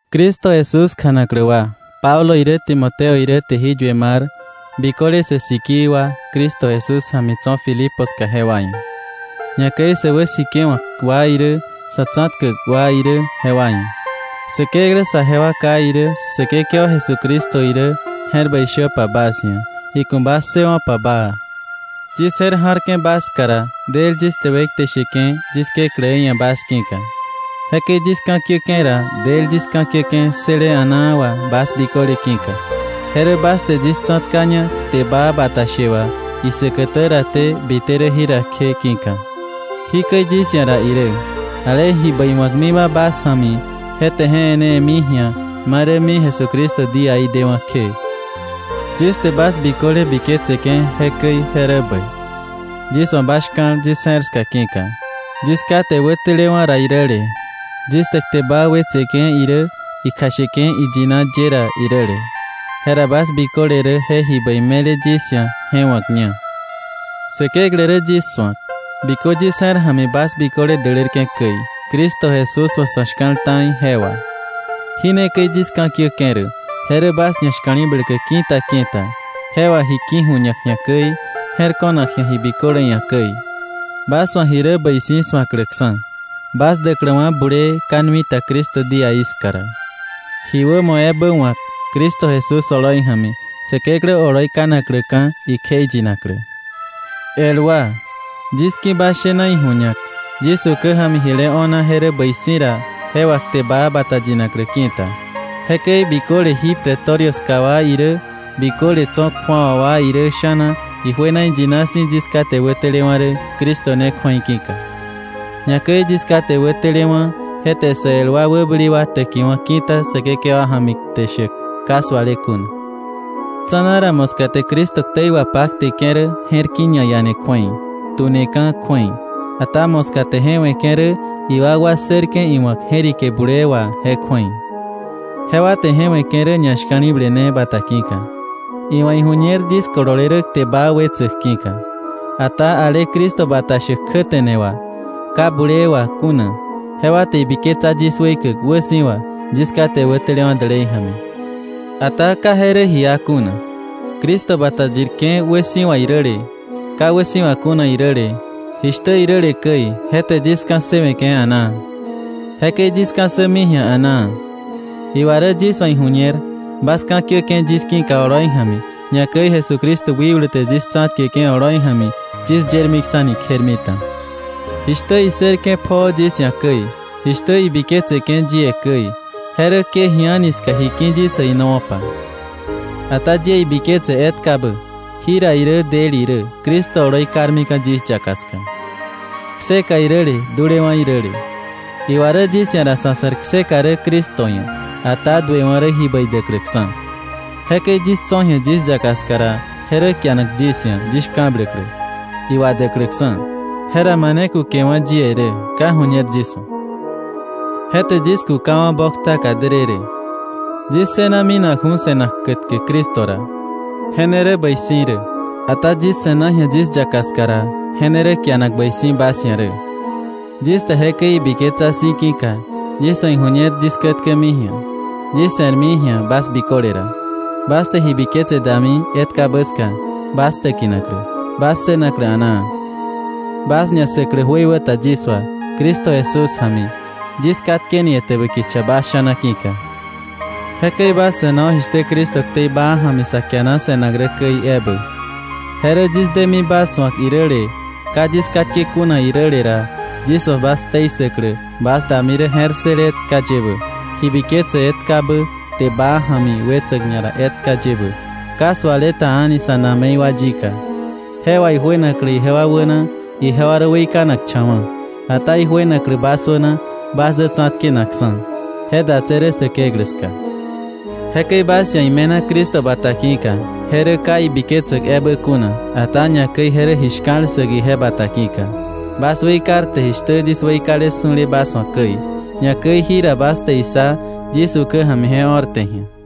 Cristo Jesús kjanaklä wa Pablo irä Timoteo irä te jí yue mar biköle sä sikii wa Cristo Jesús ja̱mi tso̱ Filipo ska jewa ia̱, ñakäi sä wäsikewa̱k wa irä sa̱ tsa̱tkäk wa irä jewa ia̱. Säkeklä saje wa Ká irä Säkekewa Jesucristo irä, je̱r bäi shöpa bas ia̱, iku̱ bas ssëwo̱pa baa. Yis je̱r ja̱rke̱ bas ska ra, del yis te wekte sheke̱ yis Kekläí ia̱ bas ki̱ka. Jekäi yis ka̱kiäke̱ ra, del yis ka̱kiäke̱ ssële a̱naa wà bas biköle ki̱ka, je rä bas te yis tsa̱tkaña kte baa bata she wà isäkätä raté bite rä jira kje ki̱ka. Jikäi yis ia̱ ra irä: Ale ji bäi wa̱kmiba bas ja̱mi, je te je e̱newe̱mi ji̱a ma rämi Jesucristo díaí dewa̱ kje. Yis te bas biköle biketseke̱ jekäi je rä bäi, yis wa̱ bas shka̱l yis je̱r ska ki̱ka. Yis kate wätelewa̱ ra iräle, yis te kte baa wetseke̱ irä ikjasheke̱ iyina ye ra iräle, jera bas biköle rä je ji bäi me̱le yis ia̱ je wa̱kña. Säkeklä rä yis su̱ak, bikö yis je̱r ja̱mi bas biköle dälärke̱ käi Cristo Jesús wa̱ sa̱ shka̱l ta̱i je wà. Jí ne käi yis ka̱kiäke̱ rä, je rä bas ñashka̱li̱bläklä ki̱ta ki̱ta, je wà ji ki̱ju̱ñak ji̱a käi, je̱r ko̱nak ji̱a ji biköle ia̱ käi, bas wa̱ ji rä bäi si̱ su̱akläksa̱, bas däkläwa̱ bulee ka nui ta Cristo díaí ska ra, ji wämo ebä wa̱k Cristo Jesús oloi ja̱mi Säkeklä oloi kanakläka̱ ikjeiyinaklä. El wa, yis ki̱ bas shena iju̱ñak, yis ukä ja̱mi jile o̱na je rä bäi si̱ ra je wà kte baa bata yinaklä ki̱ta. Jekäi biköle jí Pretorio ska wa irä biköle tso̱ kju̱awa wa irä sha̱na ijuena iyina si̱ yis kate wätelewa̱ rä Cristo ne kju̱ei ki̱ka, ñakäi yis kate wätelewa̱ je te sä el wa wäbäli wa täkiwa̱ ki̱ta Säkekewa ja̱mi kte shäk ka suale kuna. Tsa̱na ra moska te Cristo ktei wapakteke̱ rä je̱r ki̱ ñaiane kju̱ei, tuneka̱ kju̱ei. Ata moska te je we̱ke̱ rä iwakwa ssërke̱ iwa̱k je̱rike bulee wà je kju̱ei. Jewa te je we̱ke̱ rä ñashka̱li̱ble ne bata ki̱ka, iwa̱ iju̱ñer yis kolole rä kte baa wetsäk ki̱ka. Ata ale Cristo bata shäk kjäte̱ne wà, ka bulee wà kuna, jewa te ibiketsa yis weikäk wäsi̱wa yis kate wätelewa̱ dälei ja̱mi. Ata ka je rä ji iá kuna. Cristo bata yirke̱ wäsi̱wa iräle, ka wäsi̱wa kuna iräle, jishtä iräle käi, je te yis ka̱ssëwe̱ke̱ a̱naa. Jekäi yis ka̱ssämi ji̱a a̱naa. Iwa rä yis wa̱ iju̱ñer bas ka̱kiäke̱ yis ki̱ka oloi ja̱mi, ñakäi Jesucristo wikblu te yis tsa̱tkeke̱ oloi ja̱mi yis yermiksa̱ni kjermita, jishtä issërke̱ pjoo yis ia̱ käi, jishtä ibiketseke̱ yie käi, je rä ke ji a̱ni ska ji ki̱ yis äinowa̱pa. Ata yie ibiketse etkabä jira irä del irä Cristo oloi karmika̱ yis yaka ska, kseka iräle dulewa̱ iräle. Iwa rä yis ia̱ ra sa̱ se̱r kseka rä Cristo ia̱, ata duewa̱ rä ji bäi däkläksa̱. Jekäi yis tso̱ ji̱a yis yaka ska ra, je rä kianak yis ia̱ yis shka̱bläklä, iwadäkläksa̱. Jera mane kukewa̱ yie rä, ka ju̱ñer yis wa̱. Je te yis kukawa̱ boktaka därërë. Yis ssëna minakju̱ se̱nak kätkä Cristo ra, je ne rä bäi si̱ rä. Ata yis se̱na ji̱a yis yaka ska ra, je ne rä kianak bäi si̱ bas ia̱ rä. Yis te jekäi ibiketsa si̱ ki̱ka, yis wa̱ iju̱ñer yis kätkämi ji̱a, yis se̱rmi ji̱a bas biköle ra, bas te ji biketse dami etkabä ska bas täkinaklä, bas ssënaklä a̱naa, bas ñassäklä jöiwäta yis wà Cristo Jesús ja̱mi, yis katkeni etäbä kicha bas sha̱na ki̱ka. Jekäi bas se̱no jishtä Cristo ktei baa ja̱mi sa kiana se̱nak rä käi ebä. Je rä yis demi bas su̱ak iräle ka yis katke kuna iräle ra, yis wa̱ bas ktei ssäklä bas dami rä je̱r ssële etka yebä, ji biketse etkabä kte baa ja̱mi wetsäk ñara etka yebä, ka suale ta a̱ni sa̱ na̱me̱i wa yika, je wà ijuenaklä ijewa wäna ijewa rä weikanakcha̱wa̱, ata ijuenaklä bas wäna bas dä tsa̱tkenakksa̱; je datse̱ rä Säkeklä ska. Jekäi bas ia̱ ime̱na Cristo bata ki̱ka, je rä ka ibiketsäk ebä kuna, ata ñakäi je rä ji shka̱l ssäk ije bata ki̱ka. Bas weikarte jishtä yis weikale su̱le bas wa̱ käi, ñakäi jira bas te issa yis ukä ja̱mi je o̱rte ji̱a.